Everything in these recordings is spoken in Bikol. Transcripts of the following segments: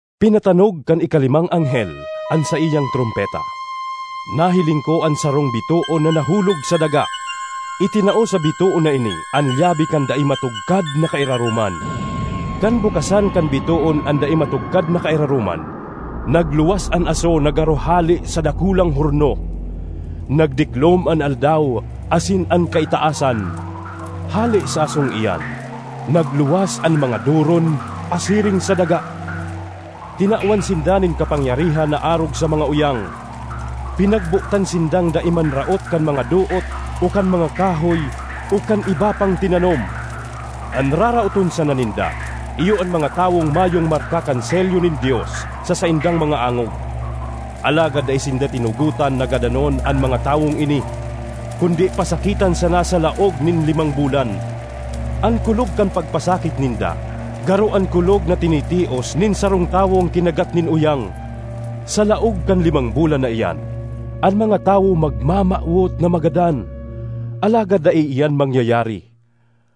Pinatanog kan ikalimang anghel an saiyang trompeta. Nahiling ko an sarong bitoon na nahulog sa daga; itinao sa bitoon na ini an lyabe kan dai matugkad na kairaroman. Kan bukasan kan bitoon an dai matugkad na kairaroman, nagluwas an aso na garo hale sa dakulang horno; nagdiklom an aldaw asin an kaitaasan. Hale sa asong iyan, nagluwas an mga doron pasiring sa daga; tinawan sinda nin kapangyarihan na arog sa mga uyang. Pinagbotan sindang dai manraot kan mga doot o kan mga kahoy o kan iba pang tinanom. An raraoton sana ninda iyo an mga tawong mayong marka kan selyo nin Dios sa saindang mga angog. Alagad dai sinda tinugotan na gadanon an mga tawong ini, kundi pasakitan sana sa laog nin limang bulan. An kulog kan pagpasakit ninda garo an kulog na tinitios nin sarong tawong kinagat nin uyang. Sa laog kan limang bulan na iyan, an mga tawo magmamawot na magadan, alagad dai iyan mangyayari;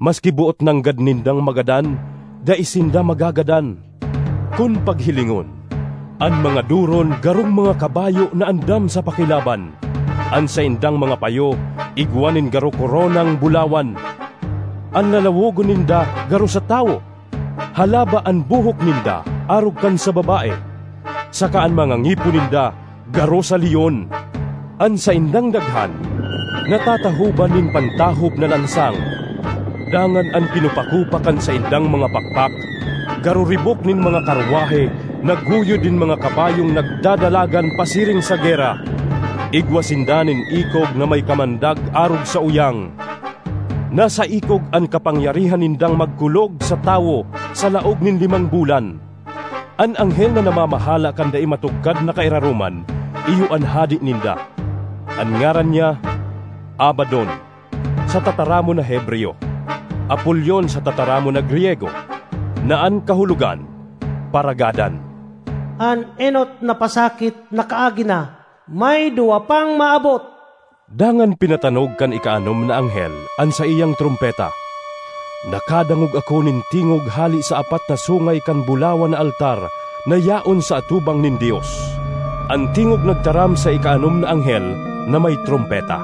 maski boot nanggad nindang magadan, dai sinda magagadan. Kun paghilingon, an mga doron garong mga kabayo na andam sa pakilaban; an saindang mga payo igwa nin garo koronang bulawan; an lalawogon ninda garo sa tawo. Halaba an buhok ninda arog kan sa babae, saka an mga ngipon ninda garo sa leon. An saindang daghan natatahoban nin pantahob na lansang dangan an kinupakupa kan saindang mga pakpak garo ribok nin mga karwahe na guyod nin mga kabayong nagdadalagan pasiring sa gera. Igwa sinda nin ikog na may kamandag arog sa uyang. Nasa ikog an kapangyarihan nindang magkulog sa tawo sa laog nin limang bulan. An anghel na namamahala kan dai matugkad na kairaroman iyo an hade ninda; an ngaran niya Abadon sa tataramon na Hebreyo; Apolion sa tataramon na Griyego, na an kahulogan, Paragadan. An enot na pasakit nakaagi na; may duwa pang maabot. Dangan pinatanog kan ikaanom na anghel an saiyang trompeta. Nakadangog ako nin tingog hale sa apat na sungay kan bulawan na altar na yaon sa atubang nin Dios. An tingog nagtaram sa ikaanom na anghel na may trompeta,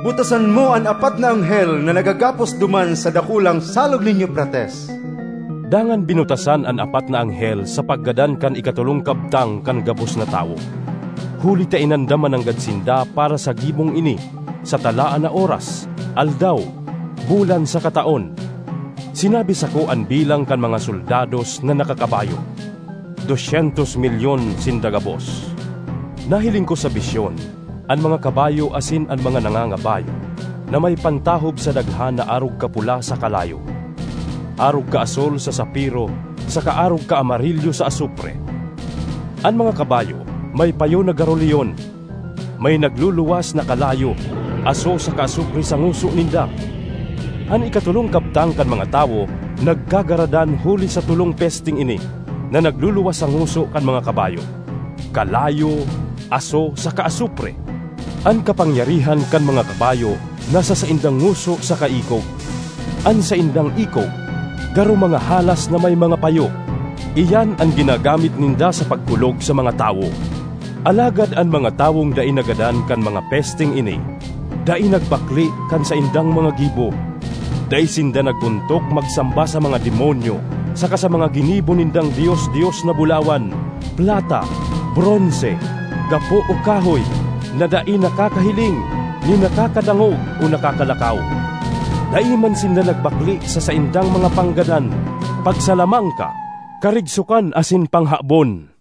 “Butasan mo an apat na anghel na nagagapos duman sa dakulang Salog nin Eufrates!” Dangan binutasan an apat na anghel sa paggadan kan ikatolong kabtang kan gabos na tawo, huli ta inandam mananggad sinda para sa gibong ini sa talaan na oras, aldaw, bulan saka taon. Sinabi sako an bilang kan mga soldados na nakakabayo; dos syentos milyon sinda gabos. Nahiling ko sa bisyon an mga kabayo asin an mga nangangabayo na may pantahob sa daghan na arog kapula sa kalayo, arog kaasul sa sapiro saka arog kaamarilyo sa asupre. An mga kabayo may payo na garo leon: may nagluluwas na kalayo, aso saka asupre sa ngoso ninda. An ikatolong kabtang kan mga tawo nagkagaradan huli sa tolong pesteng ini na nagluluwas sa ngoso kan mga kabayo: kalayo, aso saka asupre. An kapangyarihan kan mga kabayo nasa saindang ngoso saka ikog. An saindang ikog garo mga halas na may mga payo; iyan an ginagamit ninda sa pagkulog sa mga tawo. Alagad an mga tawong dai nagadan kan mga pesteng ini dai nagbakle kan saindang mga gibo. Dai sinda nag-ontok magsamba sa mga demonyo saka sa mga ginibo nindang dios-dios na bulawan, plata, bronse, gapo o kahoy, na dai nakakahiling ni nakakadangog o nakakalakaw. Dai man sinda nagbakle sa saindang mga panggadan, pagsalamangka, karigsokan asin panghabon.